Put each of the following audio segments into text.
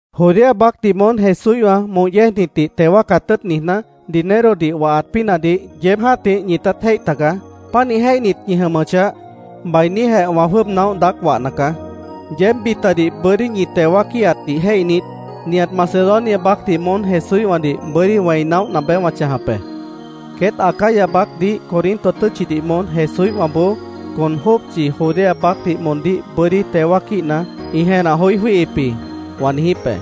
Judea baácdih moón Jesúíhwã moh yéejnitdih teo wáacat tʉ́ʉt niijná, dinerodih wahat pínahdih yeéb jã́tih ñitát jéih tagaá. Pánih jéihnit ñi jʉmʉchah, bainíjeh wã jwʉ́ʉb naóh daác wahna caá. Yeéb bitadih bʉ́dí ñi teo wáaquíhatdih jéihnit, nihat Macedonia baácdih moón Jesúíhwãdih bʉ́dí niíj wẽi naóhna beé wã chãjap be. “Queét Acaya baácdih Corinto tʉ́tchidih moón Jesúíhwãboó con jópchi Judea baácdih moondíh bʉ́dí teo wáaquíhat ĩ jenah joí jwíihip jĩ”, wã niijíp be.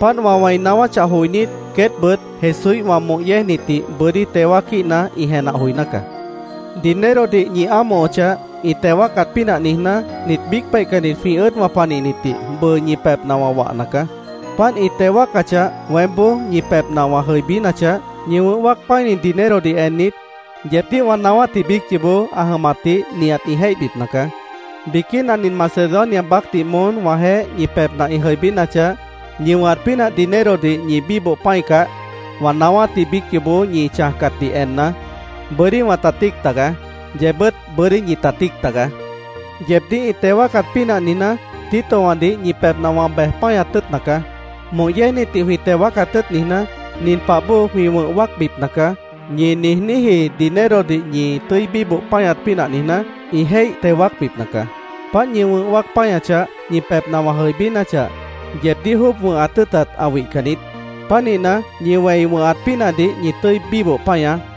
Páant wã wẽi naáwáchah joinít, queétbʉt Jesúíhwã moh yéejnitdih bʉ́dí teo wáaquíhat ĩ jenah joiná caá. Dinerodih ñi ámohochah, ĩ teo wáacat pínah niijná, nit biíc peihcannit jwĩ ʉ́ʉdwã panihnitdih bʉʉ ñi pebhna wã wahna caá. Páant ĩ teo wáacachah, weémboó ñi pebhna wã jʉibínachah, ñi wʉ̃h wáac pã́ini dinerodih ennit, yeebdíh wã naáwátji biíc yoobó ã jʉmatdih nihat ĩ jéihbipna caá. Biquína nin Macedonia baácdih moón wãjeéh ñi pebhna ĩ jʉibínachah, ñi wʉ̃hat pínah dinerodih ñi bíboh pã́icah, wã naáwátji biíc yoobó ñi chãjcatdih enna, bʉ́dí wãta tíic tagaá. Yeebbʉ́t bʉ́dí ñita tíic tagaá. Yeebdíh ĩ teo wáacat pínah niijná, Titowãdih ñi pebhna wã bej páñat tʉ́ʉtna caá. “Moh yéejnitdih jwĩ teo wáacat tʉ́ʉt niijná, nin pah bóo jwĩ wʉ̃h wáacbipna caá”, ñi niijníji dinerodih ñi tʉ́i bíboh páñat pínah niijná, ĩ jéih teo wáacbipna caá. Páant ñi wʉ̃h wáac páñachah, ñi pebhna wã jʉibínachah, yeebdíh jwʉ́ʉb wʉ̃hat tʉ́ʉtat ã wihcan niít. Pánihna, ñi wẽi wʉ̃hat pínahdih ñi tʉ́i bíboh páñaá.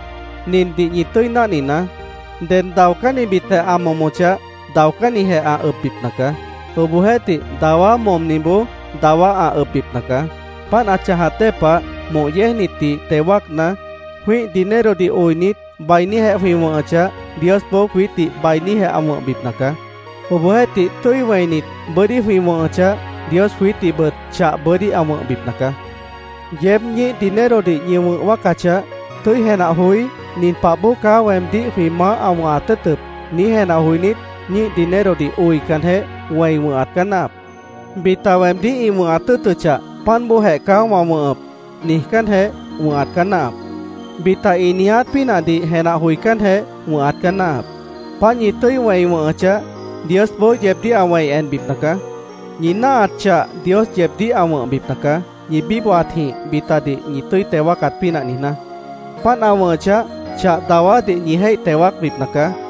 Nindih ñi tʉ́i náhninaá: Ded daocánnibitjeh ã momochah, daocánnijeh ã ʉbbipna caá. Obohjeéhtih, dawá momniboó dawá ã ʉbbipna caá. Páant ã chãjat dée pah, moh yéejnitdih teo wáacna, jwĩ́ih dinerodih oinit, bainíjeh jwĩ wʉ̃hʉchah, Diosboó jwiítdih bainíjeh ã wʉ̃hbipna caá. Obohjeéhtih, tʉ́i wẽinit, bʉ́dí jwĩ wʉ̃hʉchah, Dios jwiítdihbʉt chah bʉ́dí ã wʉ̃hbipna caá. Yeéb ñíih dinerodih ñi wʉ̃h wáacachah, tʉ́i jenah joí, “Nin pah bóo caá weemdíh jwĩ Maáh ã wʉ̃hat tʉ́ʉtʉp”, niíj jenah joinít, ñíih dinerodih oicanjeh, wẽi wʉ̃hat caá náahap. “Bita weemdíh ĩ wʉ̃hat tʉ́ʉtʉchah, páant bóojeh caá wã wʉ̃hʉp”, niijcánjeh wʉ̃hat caá náahap. Bita ĩ niiját pínahdih jenah joicánjeh wʉ̃hat caá náahap. Páant, ñi tʉ́i wẽi wʉ̃hʉchah, Diosboó yeebdíh ã wẽi enbipna caá. Ñi náahat chah Dios yeebdíh ã wʉ̃hbipna caá, ñi bíbohatjĩh bitadih ñi tʉ́i teo wáacat pínah niijná. Páant ã wʉ̃hʉchah, chah dawádih ñi jéih teo wáacbipna caá.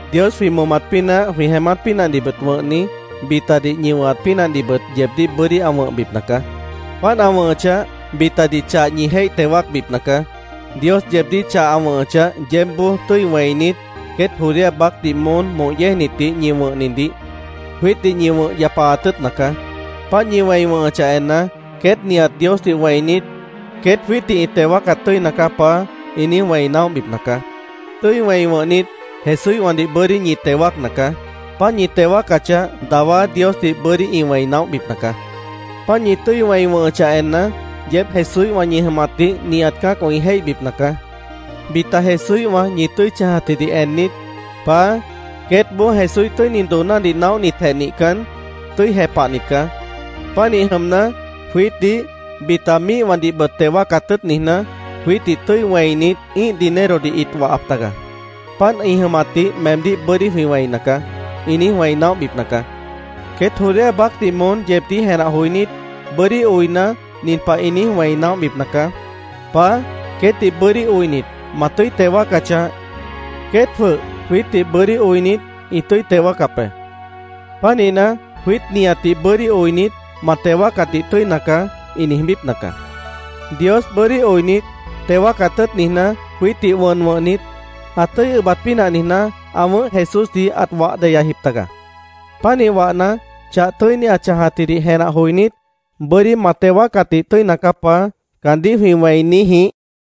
Dios jwĩ momat pínah, jwĩ jeémát pínahdihbʉt wʉ̃hni, bitadih ñi wʉ̃hat pínahdihbʉt yeebdíh bʉ́dí ã wʉ̃hbipna caá. Páant ã wʉ̃hʉchah, bitadih chah ñi jéih teo wáacbipna caá. Dios yeebdíh chah ã wʉ̃hʉchah, yeébboó tʉ́i wẽinit, queét Judea baácdih moón moh yéejnitdih ñi wʉ̃hnidih jwiítdih ñi wʉ̃h yapaat tʉ́ʉtna caá. Páant ñi wẽi wʉ̃hʉchah enna, queét nihat Diosdih wẽinit, “Queét jwiítdih ĩ teo wáacat tʉ́ina caá, Paá”, ĩ niíj wẽi naóhbipna caá. Tʉ́i wẽi wʉ̃hnit, Jesúíhwãdih bʉ́dí ñi teo wáacna caá. Páant ñi teo wáacachah, dawá Diosdih bʉ́dí ĩ wẽi naóhbipna caá. Páant ñi tʉ́i wẽi wʉ̃hʉchah enna, yeéb Jesúíhwã ñi jʉmatdih nihat cã́acwã ĩ jéihbipna caá. Bita Jesúíhwã ñi tʉ́i chãjatjidih ennit, “Paá, queétboó Jesúíh tʉ́ini doonádih naóhnitjeh nihcan, tʉ́i jepahnit caá. Pánih jʉmna, jwiítdih, bita míihwãdihbʉt teo wáacat tʉ́ʉt niijná, jwiítdih tʉ́i wẽinit ĩ́ih dinerodih ĩt wahap taga. Páant ĩ jʉmatdih meemdíh bʉ́dí jwĩ wẽina caá”, ĩ niíj wẽi naóhbipna caá. Queét Judea baácdih moón yeebdíh jenah joinít, bʉ́dí oina, nin pah ĩ niíj wẽi naóhbipna caá: “Paá, queétdih bʉ́dí oinit, ma tʉ́i teo wáacachah, queét jwʉh jwiítdihbʉt bʉ́dí oinit, ĩ tʉ́i teo wáacap be. Pánihna, jwiít nihatdih bʉ́dí oinit, ma teo wáacatdih tʉ́ina caá”, ĩ niijbípna caá. Dios bʉ́dí oinit, teo wáacat tʉ́ʉt niijná, jwiítdih wʉn wʉ̃hnit, ã tʉ́i ʉbat pínah niijná, ã wʉ̃ʉ́h Jesúsdih ãt wah deyajip taga. Pánih wahna, chah tʉ́ini ã chãjatjidih jenah joinít, “Bʉ́dí ma teo wáacatdih tʉ́ina caá, Paá”, caandíh jwĩ wẽi niíj jĩíh.